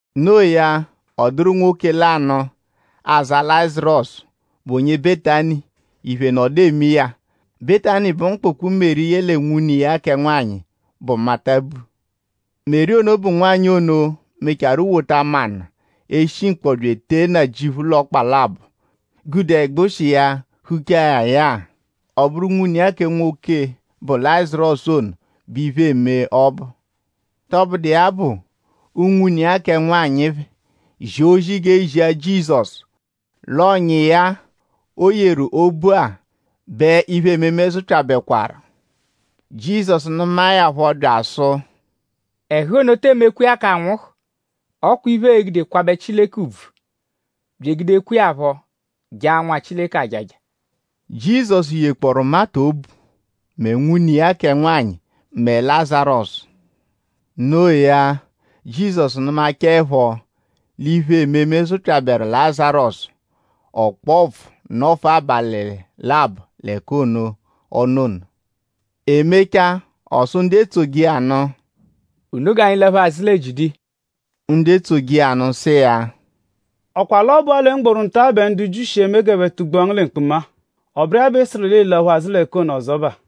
Noo ya; ọ dụru nwoke lanụ, aza Lazarọsu, bụ onye Betani; iphe nọdu eme iya. Betani bụ mkpụkpu, Meri yẹle nwune iya kẹ nwanyị, bụ Mata bu. Meri ono bụ nwanyị ono, mecharu wota manụ, eshi mkpọ bya etee Nnajịuphu l'ọkpa labọ; gude ẹgbushi iya huchaa ya ya-a. Ọ bụru nwune iya kẹ nwoke bụ Lazarọsu ono, bẹ iphe eme ọbu. Tọbudu iya bụ; unwune iya kẹ nwanyị phẹ zia ozi g'e zia Jizọsu l'ọ̀nyà iya-a, o yeru obu-a bẹ iphe-ememe zụpyabekwaru. Jizọsu nụmae ya phọ bya asụ: “Ẹhu ono te emekwa iya k'anwụhu. Ọ kwa iphe, ee-gude kwabẹ Chileke ùbvù; bya egudekwa iya phọ jaa Nwa Chileke ajaja.” Jizọsu yekpọoru Mata obu; mẹ nwune iya kẹ nwanyị; mẹ Lazarọsu. Noo ya; Jizọsu nụmachaepho l'iphe-ememe zụpyaberu Lazarọsu; ọ kpọo ụpfu nọfua abalị labọ l'ẹka ono, ọ nọ ono. E mechaa; ọ sụ ndu etsoje iya nụ: “Unu g'anyi laphu azụ lẹ Jiudiya.” Ndu etsoje iya nụ sụ iya: “?Ọ kwa l'ọ bụ-a mgboru nta-a bẹ ndu Jiu shi eme g'ẹphe tugbua ngu lẹ mkpuma-a? Ọ bụru iya bẹ ị sụru l'ịi-laphu azụ l'ẹka ono ọzobaa.”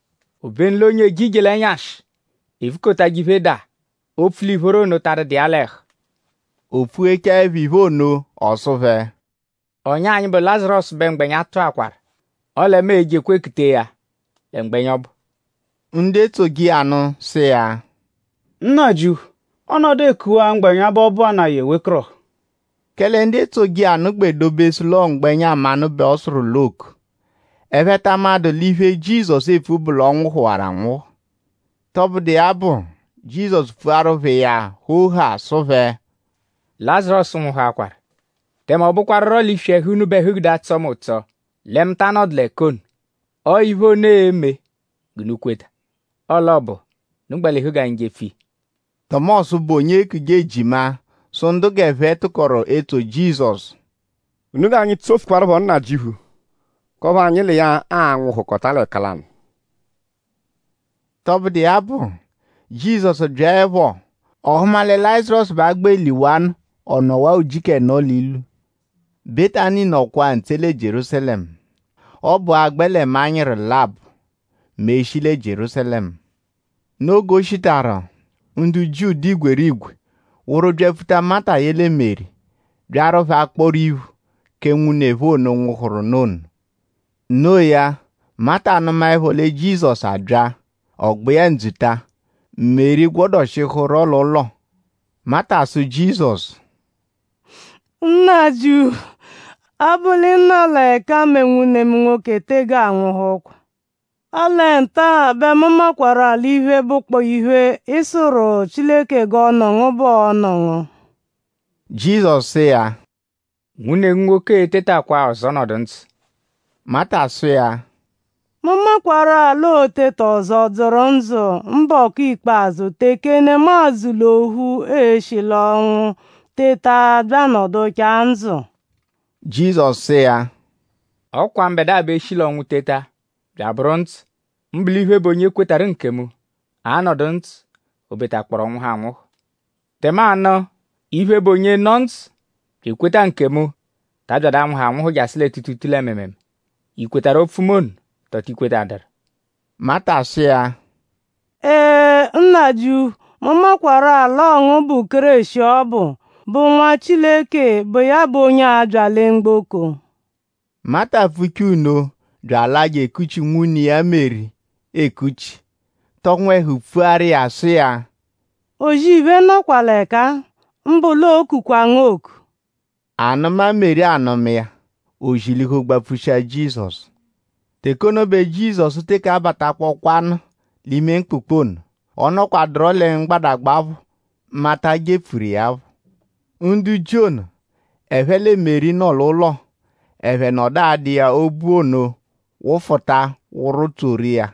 Obenu l'onye eje ije l'ẹnyashi evukotajẹ iphe daa opfu l'ìphóró ono ta adụdu iya l'ẹhu.” O pfughechaẹpho iphe ono; ọ sụ phẹ: “Ọ̀nyà anyi, bụ Lazarọsu bẹ mgbẹnya tụakwaru; ọle mu e-jekwa ekutee ya lẹ mgbẹnya ọbu.” Ndu etsoje iya nụ sụ iya: “Nnajịuphu! Ọ -nọdu ekuwaa mgbẹnya bẹ ọ bụanaa ya ewekọrohu.” Kẹle ndu etsoje iya nụ gbẹ dobesụ l'ọo mgbẹnya mmanụ bẹ ọ sụru l'ooku. Ẹphe ta amadụ l'iphe, Jizọsu epfu bụ l'ọ nwụhuwaru anwụhu. Tọbudu iya bụ; Jizọsu pfuaru phẹ iya hoo haa sụ phẹ: “Lazarọsu nwụhuakwaru.” “Tẹme ọ bụkwaruro l'iswi ẹhu unu bẹ ẹhu gude atsọ mu ụtso lẹ mu ta anọdu l'ẹka ono. Ọo iphe ono e-me g'unu kweta. Ọle ọ bụ; unu gbalihu g'anyi jepfu iya.” Tọmosu, bụ onye eekuje “Ejima” sụ ndu g'ẹphe tụkoru etsoje Jizọsu: “Unu g'anyi tsofukwaaruphọ Nnajịuphu; k'ọphu anyi l'iya a-nwụhukota l'ẹka lanụ.” Tọbudu iya bụ; Jizọsu byaẹpho; ọ hụma lẹ Lazarọsu bẹ a gbẹ liwanụ ọ nọwanu ujiku ẹno l'ilu. Betani nọkwaa ntse lẹ Jierúsalẹmu. Ọ bụa; a -gbẹ lẹ manyịru labọ mẹ e -shi lẹ Jierúsalẹmu. Noo g'o shitaru; ndu Jiu dụ igwerigwe wụru byapfuta Mata yẹle Meri; byaru phẹ akpọru iphu kẹ nwune phẹ ono, nwụhuru nụ ono. No iya; Mata nụmaepho lẹ Jizọsu abya; ọ gba iya ndzuta. Meri gwọdoshihuro l'ụlo. Mata sụ Jizọsu: “Nnajịuphu; ọ -bụ l'ị nọ l'ẹka-a mẹ nwune mu nwoke ono tege anwụhukwa. Ọle nta-a bẹ mu makwarụ-a l'iphe, bụkpoo iphe, ị sụru Chileke g'ọ nụ ngu bẹ ọo-nụ ngu.” Jizọsu sụ iya: “Nwune ngu nwoke e-tetakwa-a ọzo nọdu ndzụ.” Mata sụ iya: “Mu makwarụ-a l'oo-teta ọzo dzụru ndzụ mbọku ikpazụ teke nemadzụ l'ophu e-shi l'ọnwu teta bya anọduchaa ndzụ.” Jizọsu sụ iya: “Ọ kwa mbẹdua bụ eshi l'ọnwu teta bya abụru ndzụ. Mbụ l'iphe, bụ onye kwetarụ nkemu a-nọdu ndzụ o betakpọoru ọ nwụhu anwụhu. Tẹmanu; iphe, bụ onye nọ ndzụ bya ekweta nkemu taa byadu anwụhu anwụhu jasụ lẹ tuutuutuu lẹ mịimiimii.?I kwetarụ opfu mu ono; tọo ti kwetadụru?” Mata sụ iya: “Ee; Nnajịuphu. Mu kwekwaru-a l'ọo ngu bụ Kéreshi ọbu, bụ Nwa Chileke, bụ iya bụ onye ọbu, a-bya lẹ mgboko.” Mata pfuchaa nno bya alaa je ekuchi nwune iya Meri ekuchi; tọ nwẹhu pfuaru iya sụ iya: “O-zì-iphe nọkwa l'ẹka-a; mbụ l'ookukwa ngu oku.” Anụma, Meri anụma iya; o zilihu gbapfushia Jizọsu. Teke ono bẹ Jizọsu teke abatakpọkwanu l'ime mkpụkpu ono. Ọ nọkwaduro lẹ mgbadagba phọ, Mata jepfuru iya phọ. Ndu Jiu ono, ẹphe lẹ Meri nọ l'ụlo; ẹphe nọdu adụ iya obu ono wụfuta wụ-tsoru iya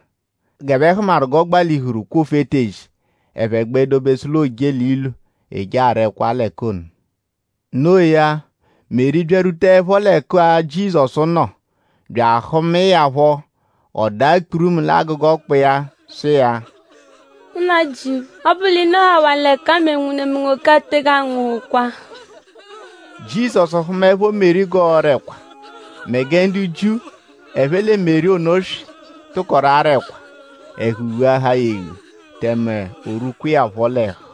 g'ẹphe hụmaru g'ọ gbalihuru kwofu etezi. Ẹphe gbẹ dobesu l'ooje l'ilu eje ara ẹkwa l'ẹka ono. Noo ya; Meri byarwutaẹpho l'ẹka Jizọsu nọ; bya ahụmae ya phọ; ọ daa kpurumu l'agụga ọkpa iya sụ iya: “Nnajịuphu! Ọ -bụ l'ị nọhawaa l'ẹka-a mẹ nwune mu nwoke-a tege anwụhukwa.” Jizọsu hụmaepho Meri g'ọora ẹkwa mẹ gẹ ndu Jiu, ẹphe lẹ Meri ono swị tụkoru ara ẹkwa; ẹhu ghuahaa ya eghu; tẹme o rwuhukwa iya phọ l'ẹhu.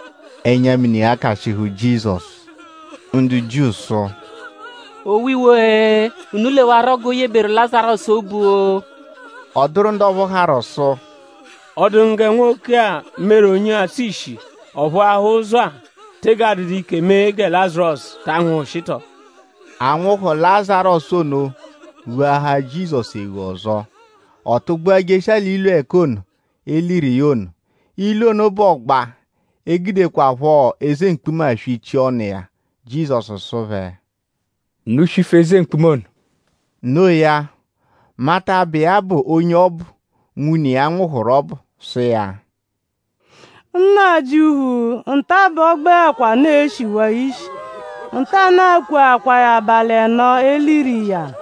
Ẹnya-mini ghakashịhu Jizọsu. Ndu Jiu sụ: “Owiwo-e! Unu lewarọ g'o yeberu Lazarọsu obu-o!” Ọ dụru ndu ọphu harụ sụ: “?Ọ dụ ngu gẹ nwoke-a, meru onye atsụ ishi; ọ phụahaa ụzo-a tege adụdu ike mee gẹ Lazarọsu ta anwụhushi tọo?” Anwụhu Lazarọsu ono ghuahaa Jizọsu eghu ọzo; ọ tụgbua jeshia l'ilu ẹka ono, e liru iya ono. Ilu ono bụ ọgba, e gudekwaphọ eze mkpuma swichia ọnu iya. Jizọsu sụ phẹ: “Unu swifu eze mkpuma ono.” Noo ya; Mata, bụ iya bụ onye ọ bụ nwune iya nwụhuru ọbu sụ iya: “Nnajịuphu! Nta-a bẹ ọogbekwanu eshiwaa ishi. Ntanụ-a kweakwaa ya abalị ẹno, e liru iya.”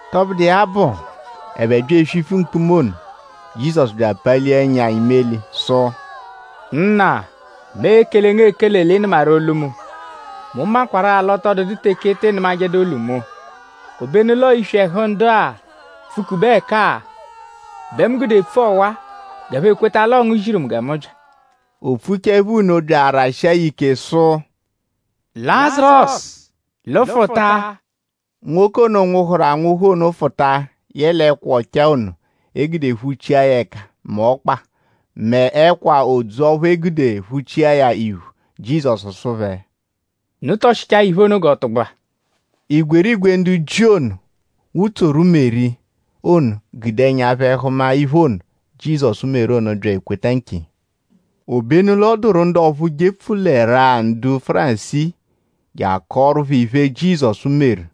Tọbudu iya bụ; ẹphe bya eswifu mkpuma ono. Jizọsu bya apalia ẹnya imeli sụ: “Nna! Mu ekele ngu ekele; l'ị nụmaru olu mu. Mu makwarụ-a l'ọ tọ dụdu teke ị tịi nụmajedu olu mu. Obenu l'ọo iswi ẹhu ndu-a, pfụ-kube ẹka-a bẹ mu gude epfu ọwa g'ẹphe ekweta l'ọo ngu ziru mu gẹ mu bya.” O pfuchaẹpho nno bya arashia ya ike sụ: “Lazarọsu! Lụfuta!” Nwoke ono, nwụhuru anwụhu ono fụta yẹle ẹkwa ọchaa ono, e gude phuchia ya ẹka mẹ ọkpa; mẹ ẹkwa odzu ọphu e gude phuchia ya iphu. Jizọsu sụ phẹ: “Unu tọshichaa ya iphe ono g'ọ tụgbua.” Igwerigwe ndu Jiu ono, wutsoru Meri ono gude ẹnya phẹ hụma iphe ono, Jizọsu meru ono; bya ekweta nkiya. Obenu l'ọ dụru ndu ọphu jepfulẹrua ndu Fárisii je akọoru phẹ iphe, Jizọsu meru.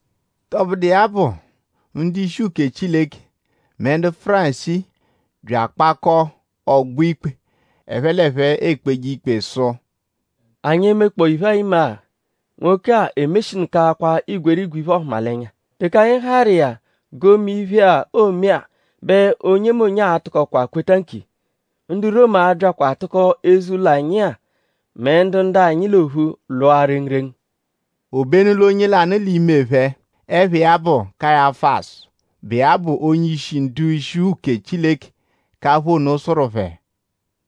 Tọbudu iya bụ; ndu-ishi uke Chileke mẹ ndu Fárisii bya akpakọo ọgbo-ikpe, ẹphe l'ẹphe ekpeje ikpe sụ: “?Anyi e-mekpọo iphe-a ime-agha? Nwoke-a emeshinụkakwa igwerigwe iphe-ọhumalenya. Teke anyi harụ iya g'o mee iphe-a, oome-a bẹ onyemonye a-tụkokwa kweta nkiya; ndu Romu a-byakwa atụko eze-ụlo anyi-a mẹ ndu ndu-anyi l'ophu lwụa rengurengu.” Obenu l'onye lanụ l'ime phẹ, ẹpha iya bụ Kayafasu, bụ iya bụ onye-ishi ndu-ishi uke Chileke k'apha ono sụru phẹ: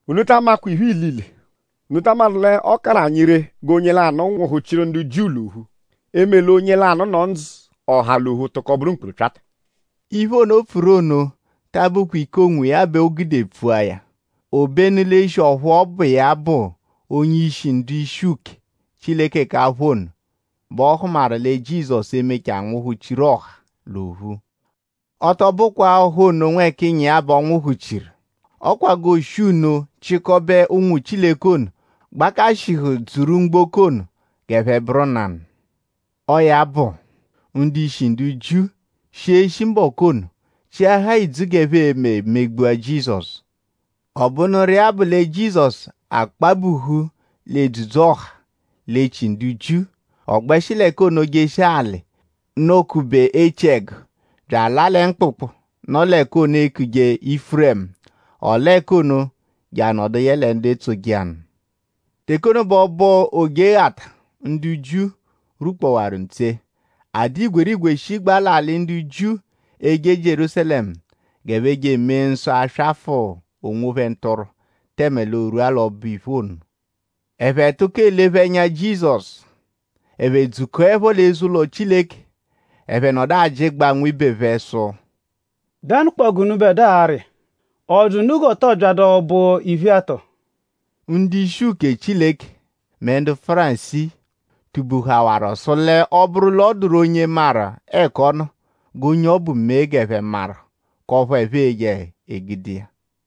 “Unu ta amakwa iphe ilile. ?Unu ta amadụ l'ọ karụ anyi ree g'onye lanụ nwụhu-chiru ndu Jiu l'ophu; eme l'onye lanụ nọ ndzụ; ọha l'ophu tụko bụru mkpurupyata.” Iphe ono, o pfuru ono ta abụkwa ike k'onwiya bẹ o gude pfua ya. Obenu l'eshi ọphu ọ bụ iya bụ onye-ishi ndu-ishi uke Chileke k'apha ono bẹ ọ hụmaru lẹ Jizọsu e-mechaa nwụhu-chiru ọha l'ophu. Ọ tọ bụkwa-a ọha ono nwẹkiya bẹ ọo-nwụhu-chiru. Ọ kwa g'ooshi nno chịkobe ụnwu Chileke ono, gbakashịhuru dzuru mgboko ono g'ẹphe bụru nanụ. Ọo ya bụ; ndu-ishi ndu Jiu shi eshi mbọku ono chịahaa idzu g'ẹphe e-me megbua Jizọsu. Ọ bụnuru iya bụ lẹ Jizọsu akpabuhu l'edzudzu-ọha l'echi ndu Jiu. Ọ gbẹshi l'ẹka ono jeshia alị, nọ-kube echiẹgu bya alaa lẹ mkpụkpu, nọ l'ẹka ono, eekuje Ifuremu. Ọ laa ẹka ono je anọdu yẹle ndu etsoje iya nụ. Teke ono bẹ ọbo Ojeghata ndu Jiu rwukpọwaru ntse. A dụ igwerigwe shigbaa l'alị ndu Jiu eje Jierúsalẹmu g'ẹphe je emee nsọ aswafụ onwophẹ ntụrwu; tẹme l'oorwua l'ọbo-iphe ono. Ẹphe tụko elephe ẹnya Jizọsu. Ẹphe dzukọepho l'eze-ụlo Chileke; ẹphe nọdu ajịjegbaa nwibe phẹ sụ: “?Dẹnukpoo g'unubẹdua arị iya??Ọ dụ unu g'ọ tọo byadu ọbo-iphe-a tọo?” Ndu-ishi uke Chileke mẹ ndu Fárisii tubuhawaru sụ l'ọ -bụru l'ọ dụru onye maru ẹka ọ nọ; g'onye ọbu mee g'ẹphe maru k'ọphu ẹphe e-je egude iya.